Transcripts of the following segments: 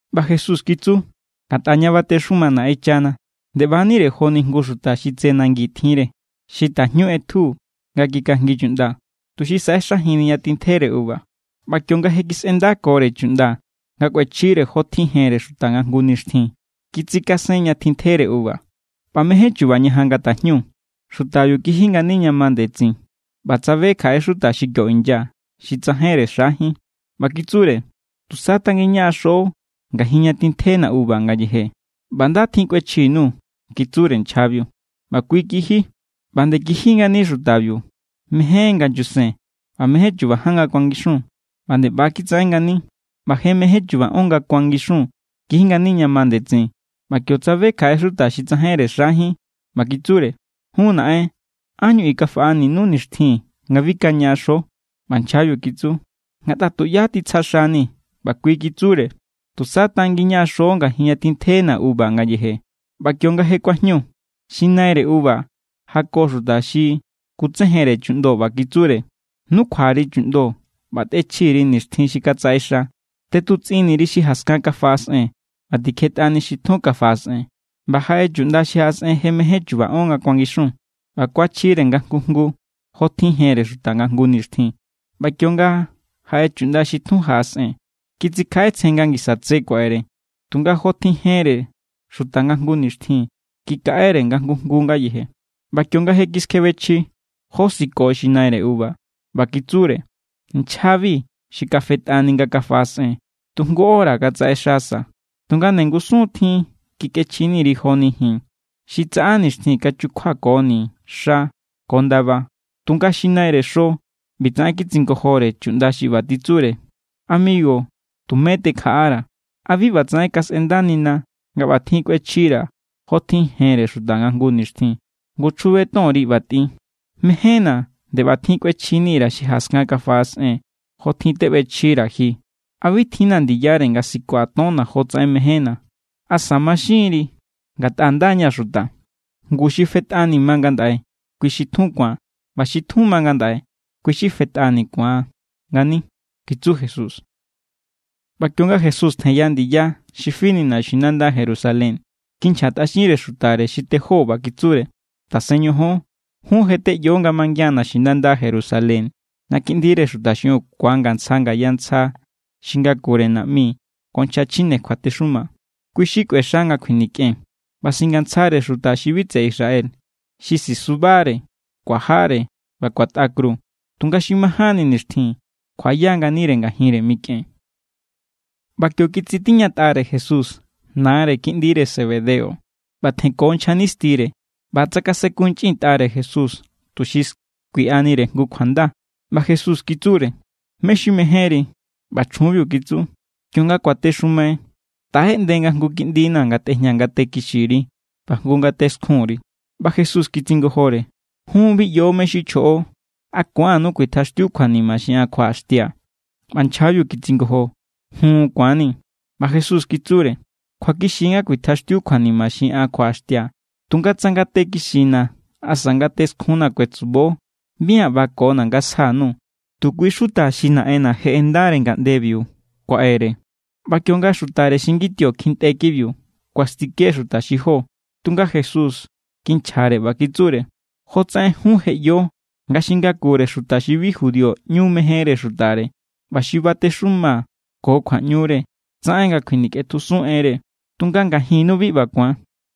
ꞌBa Jesús kitsu: —Ngatꞌa ña batexuma Naꞌenchana, nde ꞌba=nire joni jngu xuta xi tse nangi tjinre. Xi tajñu ꞌetju, nga kikajngi chuꞌnda, tuxi saꞌexajinni ña tintjere uva. ꞌBa kionga je kisꞌendakore chuꞌnda nga kꞌuechjire jotjin jenre xuta nga jngu nixtjin, kitsikasen ña tintjere uva. ꞌBa mejen chuba ñajan nga tajñu, xutabiu kiji ngani ña ma ndetsin ꞌba tsabe kjaꞌe xuta xi kio inya, xi tsajainre xajín. ꞌBa kitsure: “Tusa tangin ñaꞌaxo ngajin ña tintjena̱ uva ngayeje, ꞌba nda tjin kꞌuechji_nuu̱”, kitsure nchjabiu. ꞌBa kui kiji. ꞌBa nde kiji ngani xutabiu mejen nga nyusen, ꞌba mejen chuba ján nga kuangixun, ꞌba nde ꞌba= kitsaꞌen ngani. ꞌBa je mejen chuba ón nga kuangixun kiji ngani ña ma ndetsin, ꞌba kio tsabe kjaꞌe xuta xi tsajainre xajín. ꞌBa kitsure: “Jun naꞌen, ¿ánñu i kafaꞌañu nixtjin nga bi kañaꞌaxo?” ꞌBa nchjabiu kitsu: “Ngatꞌa tuꞌyá titsja xani̱.” ꞌBa kui kitsure: “Tusa tangin ñaꞌaxo ngajin ña tintjena̱ uva ngayeje.” ꞌBa kionga je kuajñu, xi naire uva jako xuta xi kutsejenre chuꞌndo ꞌba kitsure: “Nukjua_ri chuꞌndo ꞌba tꞌechji_ri nixtjin xi katsaꞌexa. Tꞌetutsꞌinni_ri xi jaskan kafaꞌasꞌen ꞌba tikjetꞌani xi tjun kafaꞌasꞌen.” ꞌBa jaꞌe chuꞌnda xi jaꞌasꞌen je mejen chuba ón nga kuangixun ꞌba kuachjire nga jngu jngu jotjin jenre xuta nga jngu nixtjin. ꞌBa kionga jaꞌe chuꞌnda xi tjun jaꞌasꞌen, kitsikjaꞌetsjen nga ngisa tse kuaꞌere. Tunga jotjin jenre xuta nga jngu nixtjin kikaꞌere nga jngu jngu ngayeje. ꞌBa kionga je kiskjebechji, josiko xi naire uva. ꞌBa kitsure: “Nchjabi xi kafetꞌani nga kafaꞌasꞌen, tu jngu hora= katsaꞌexasa. Tunga nde ngusun tjin kikꞌechjini_ri joni ji̱n xi tsaꞌa nixtjin kachukjuakoni xa ko ndaba.” Tunga xi naire xo ꞌbitsaꞌen kitsingojore chuꞌnda xi ꞌba titsure: “Amigu, tumé tekjaꞌara̱. ¿A bi ꞌbatsaꞌen kasꞌendanina nga ꞌbatjin kꞌuechjira̱ jotjin jenre xuta nga jngu nixtjin? Ngu chjube tonri ꞌba tꞌin. Mején=na̱ nde ꞌbatjin kꞌuechjini_ra̱ xi jaskan kafaꞌasꞌen jotjin teꞌbechjira̱ ji. ¿A bi tjinna̱ ndiyare nga sikua̱ tonna̱ jotsaꞌen mejénna̱? ¿Asa maxinri ngatꞌa nda= ña̱ xuta?” Ngu xi fetꞌani ma ngandaꞌe, kui xi tjun ku̱an. ꞌBa xi tjun ma ngandaꞌe, kui= xi fetꞌani ku̱an ngani —kitsu Jesús. ꞌBa kionga Jesús tjenya ndiya xi fini naxinanda Jerusalén, kinchjatꞌaxinre xutare xi tejó, ꞌba kitsure: —Tasen ñojon. Jun je teꞌyo nga mangian naxinanda Jerusalén ña Kiꞌndire Xuta xiꞌiun ku̱angantsja ngaya ntsja xi ngakure naꞌmi ko nchja chjine kjuatexuma. Kui= xi kꞌuexa nga kjuinikꞌen ꞌba singantsjare xuta xi bi tseꞌe Israel, xi sisubare, kuajare ꞌba kuatꞌa kru. Tunga xi majánni nixtjin kjuaꞌaya nganire ngajinre mikꞌen. ꞌBa kio kitsitiñatꞌare Jesús nare kiꞌndire Zebedeo ꞌba tjenko nchja nistire, ꞌba tsakasenkunchꞌintꞌare Jesús tuxi skuiꞌanire jngu kjuanda. ꞌBa Jesús kitsure: —¿Mé= xi mejénri? ꞌBa chjunbiu kitsu: —Kionga kuatexumai, taꞌeꞌnde nga jngu kiꞌndina̱ ngatꞌejña ngate kixiri ꞌba jngu ngate skjunri. ꞌBa Jesús kitsingojore: —Jun bi ꞌyo mé= xi chjoꞌo. ¿A ku̱annu kuitjaxtiu kjuanima xi an kjuaꞌaxtia̱? ꞌBa nchjabiu kitsingojo: —Jun. Ku̱anni̱. ꞌBa Jesús kitsure: —Kjuakixi= nga kuitjaxtiu kjuanima xi an kjuaꞌaxtia̱. Tunga tsa ngate kixina̱ asa ngate skjunna̱ kuetsubo, bi an ꞌbakona̱ nga sja_nuu̱, tu kui= xuta xi Naꞌenna̱ je ꞌendare ngaꞌndebiu kuaꞌere. ꞌBa kionga xutare xi ngitio kjintꞌe kibiu, kuastike xuta xi jó. Tunga Jesús kinchjare ꞌba kitsure: —Jotsaꞌen jun je ꞌyo nga xi ngakure xuta xi bi Judío ꞌñu mejenre xutare, ꞌba xi batexuma ko kjuaꞌñure tsaꞌen nga kjuinikꞌetjusun enre. Tunga ngajinnu bi ꞌba ku̱an.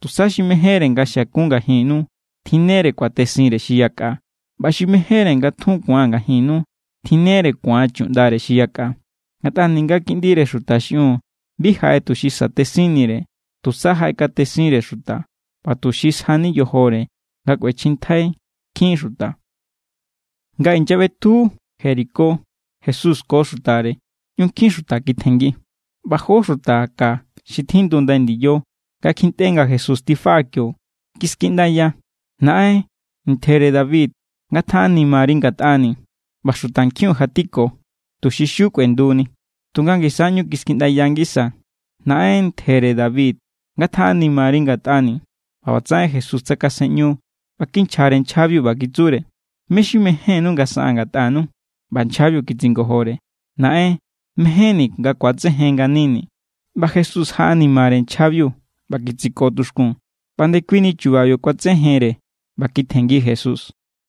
Tusa xi mejénre nga xiakun ngajinnu, tjinnere kuatesinre xi yakꞌa. ꞌBa xi mejénre nga tjun ku̱an ngajinnu, tjinnere ku̱an chuꞌndare xi yakꞌa. Ngatꞌa ninga Kiꞌndire Xuta xiꞌiun bi jaꞌe tuxi satesinnire. Tusa jaꞌekatesinre xuta ꞌba tuxi sjani yojore nga kꞌuechjintjai nkjin xuta. Nga inyaꞌbetju Jericó Jesús ko xutare, ꞌñu nkjin xuta kitjenngi. ꞌBa jó xuta ka xi tjindu ndai ndiyo, nga kjintꞌe nga Jesús tifaꞌa kio, kiskiꞌndaya: —¡Naꞌen, ntjere David, ngatjaꞌanimari ngatꞌani̱! ꞌBa xutankjiun jatiko, tuxi xiu kꞌuenduni, tunga ngisa= ꞌñu kiskiꞌndaya ngisa: —¡Naꞌen, ntjere David, ngatjaꞌanimari ngatꞌani̱! ꞌBa ꞌbatsaꞌen Jesús tsakasenꞌñu ꞌba kinchjare nchjabiu, ꞌba kitsure: —¿Mé= xi mejénnú nga saꞌaa̱n ngatꞌanu? ꞌBa nchjabiu kitsingojore: —Naꞌen, mejénni̱ nga ku̱atsejen nganini̱. ꞌBa Jesús jaꞌanimare nchjabiu ꞌba kitsiko tuxkun. ꞌBa ndekuini chubabiu kuatsejenre ꞌba kitjenngi Jesús.